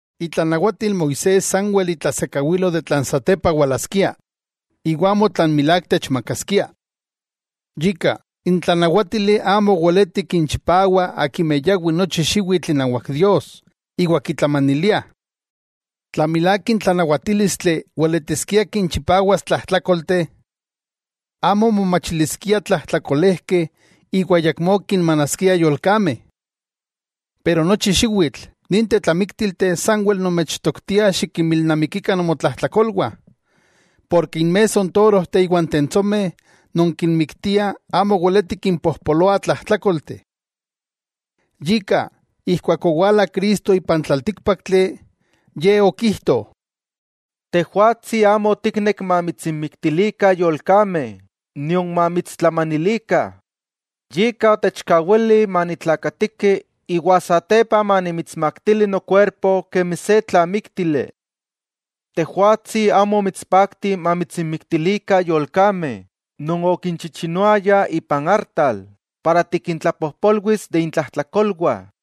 Itlanawatil Moisés sanwel itlasekawilo tlan satepa walaskia, iwa amo tlan milák techmakaskia. Yika, n tlanawátili amo weleti kinchipawa akimeh yawi nochi xiwitl inawak Dios, iwa kitlamaniliah. Tla milák n tlanawatílistli weletiskia kinchipawas tlajtlákolteh, amo momachiliskia tlajtlakolejkeh iwa ayakmó kinmanaskiah yolkameh. Pero nochi xiwitl, ninteh tlamiktilteh sanwel nomechtoktiah xikinmilnamikikah nomotlajtlakolwah, porke inmesso n torojteh iwa n tentsomeh non kinmiktiah amo weletih kimpojpoloah tlajtlákolteh. Yika, ijkuak owala Cristo ipan tlaltíkpaktli, Ye okijto: Tejwatsi amo otiknek mamitsinmiktilikah yolkameh nion mamitstlamanilikah, yika otechkawili manitlakatiki iwa satepa manimitsmaktili nokuerpo kemi se tlamíktili. Tejwatsi amo omitspakti mamitsinmiktilikah yolkameh non okinchichinoayah ipan artal para tikintlapojpolwis de intlajtlakolwah.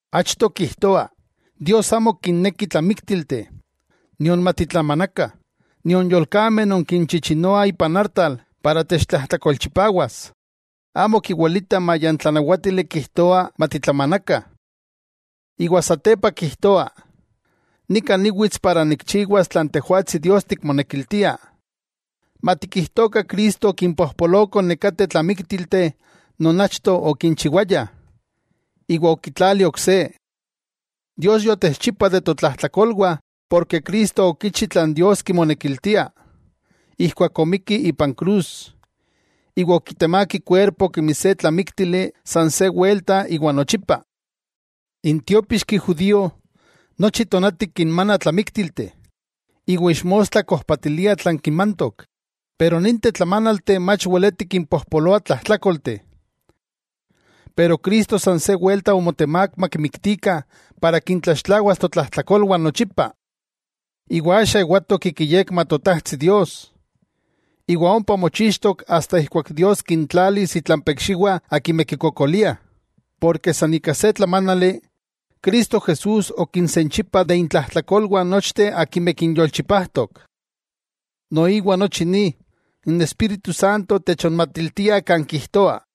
Achto kijtoa, Dios amo kinneki tlamíktilteh, nion matitlamanakah, nion yolkameh non kinchichinoah ipan artal non techtlajtlakolchipawas, amo kiwelitah maya n tlanawátili kijtoa matitlamanakah. Iwa satepa kijtoa: Nika niwits iwa nikchiwas tlan Tejwatsi Dios tikmonekiltia. Matikijtokah Cristo okinpojpoloko nekateh tlamíktilteh non achto okinchiwayah, iwa okitlali ok se. Dios yotexchipa de totlajtlakolwah porke Cristo okichi tlan Dios kimonekiltia, ijkuak omikki ipan krus, iwa okitemák ikuerpo kemi se tlamíktili san se welta iwa nochipa. N tiópixki judío, nochi tonati kinmana tlamíktilteh, iwa ixmostla kojpatilia tlan kimantok, pero ninteh tlamanalteh mach weletih kimpojpoloah tlajtlákolteh. Pero Cristo san se welta omotemák makimiktikah para kintlaxtlawas totlajtlakolwah nochipa. Iwa axa ewatok ik iyekma Totajtsi Dios. Iwa ompa mochixtok asta ijkuak Dios kintlalis itlampa ikxiwah akimeh kikokoliah, porke san ika se tlamánali, Cristo Jesús okinsenchipa de intlajtlakolwah nochteh akimeh kinyolchipajtok. Noiwa nochi ni, n Espíritu Santo techonmatiltia kan kijtoa: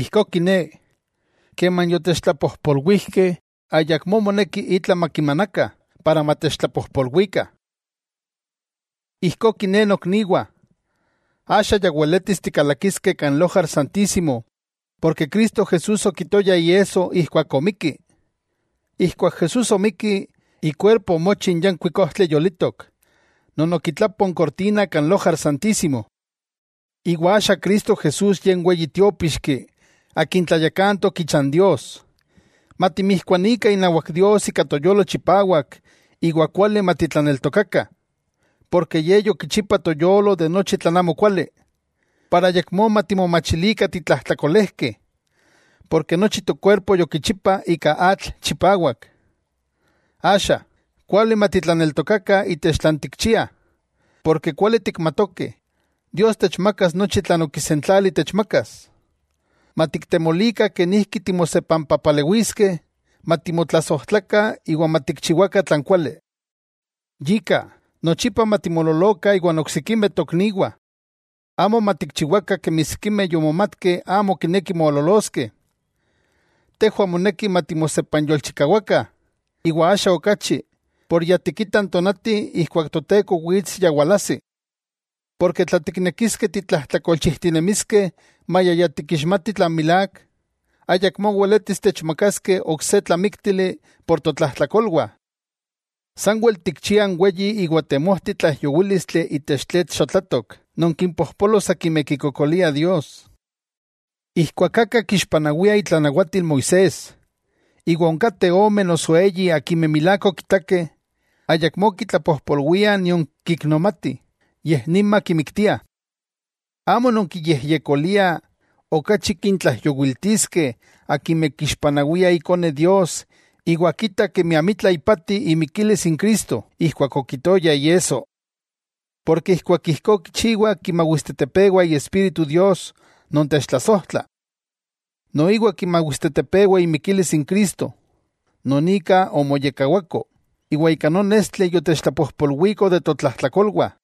Ijkó kiné, keman yotechtlapojpolwijkeh ayakmó moneki itla makimanakah para matechtlapojpolwikah. Ijkó kiné nokniwah, axa ya weletis tikalakiskeh kan Lojar Santísimo ken Cristo Jesús okitoya iesso ijkuak omikki. Ijkuak Jesús omikki, ikuerpo omochi n yankuik ojtli yolitok non okitlapo n kortina kan Lojar Santísimo, iwa axa Cristo Jesús Ye n Weyi Tiópixki akin tlayakantok icha n Dios. Matimijkuanikah inawak Dios ika toyolo chipawak iwa kuali matitlaneltokakah, porke Ye yokichipa toyolo nochi tlan amokuali, para ayakmó matimomachilikah titlajtlakolejkeh, ken nochi tokuerpo yokichipa ika atl chipawak. Axa, kuali matitlaneltokakah itech tlan tikchiah, porke kuali tikmatokeh, Dios techmakas nochi tlan okisentlali techmakas. Matiktemolikah kenijki timosepampapalewiskeh, matimotlasojtlakah iwa matikchiwakah tlan kuali. Yika, nochipa matimololokah iwan oksikimeh tokniwah, amo matikchiwakah kemi sikimeh yomomatkeh amo kinekih mololoskeh. Tejwah moneki matimosepanyolchikawakah, iwa axa okachi por ya tikitah n tonati ijkuak Toteko wits ya walajsi. Porke tla tiknekiskeh titlajtlakolchijtinemiskeh maya ya tikixmati tlan milák, ayakmó weletis techmakaskeh ok se tlamíktili por totlajtlakolwah. Sanwel tikchiah n weyi iwa temojti tlaijyowílistli itech tletl xotlatok non kimpojpolos akimeh kikokoliah Dios. Ijkuak aka kixpanawia itlanawatil Moisés, iwa onkateh ome noso eyi akimeh milák okitakeh, ayakmó kitlapojpolwiah nion kiknomatih yej nima kimiktiah. ¡Amo nonkiyejyekoliah okachi kintlaijyowiltiskeh akimeh kixpanawiah Ikone Dios iwa kitah kemi amitla ipati imikilis n Cristo ijkuak okitoya iesso! Porke ijkuak ijkó kichiwa kimawistetepewa Iespíritu Dios non techtlasojtla. Noiwa kimawistetepewa imikilis n Cristo, non ika omoyekkawako, iwa ika non estli yotechtlapojpolwiko de totlajtlakolwah.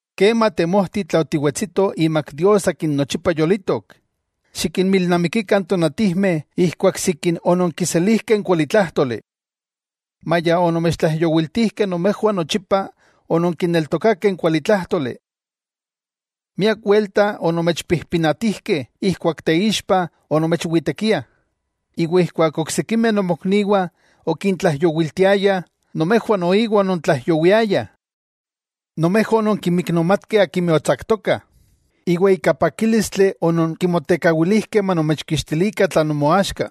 ¡Kema temojti tla otiwetsito imak Dios akin nochipa yolitok! Xikinmilnamikikah n tonatijmeh ijkuak sikin ononkiselijkeh n kualitlájtoli. Maya onomechtlaijyowiltijkeh nomejwah nochipa ononkineltokakeh n kualitlájtoli. Miak welta onomechpijpinatijkeh ijkuak teixpa onomechwitekiah, iwa ijkuak oksikimeh nomokniwah okintlaijyowiltiayah, nomejwah noiwa onontlaijyowiayah. Nomejwah ononkinmiknomatkeh akimeh otsaktokah, iwa ika pakílistli ononkimotekawilijkeh manomechkixtilikah tlan nomoaxka,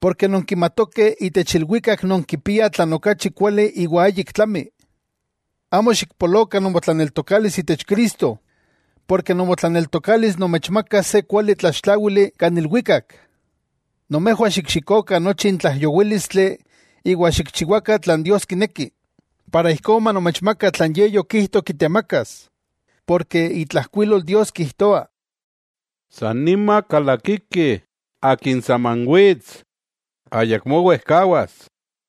porke nonkimatokeh itech ilwikak nonkipiah tlan okachi kuali iwa ayik tlami. Amo xikpolokah nomotlaneltokalis itech Cristo, porke nomotlaneltokalis nomechmakas se kuali tlaxtláwili kan ilwikak. Nomejwah xikxikokah nochi n tlaijyowílistli iwa xikchiwakah tlan Dios kineki, iwa ijkó manomechmaka tlan Ye yokijto kitemakas. Itlajkuilol Dios kijtoa: San nima kalakiki, Akin saman wits, ayakmó wejkawas.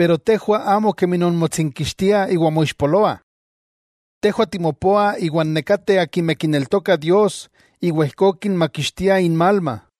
Tejwah, amo kemi nonmotsinkixtiah iwa moixpoloah. Tejwah timopoah iwan nekateh akimeh kineltokah Dios iwa ijkó kinmakixtiah inmalma.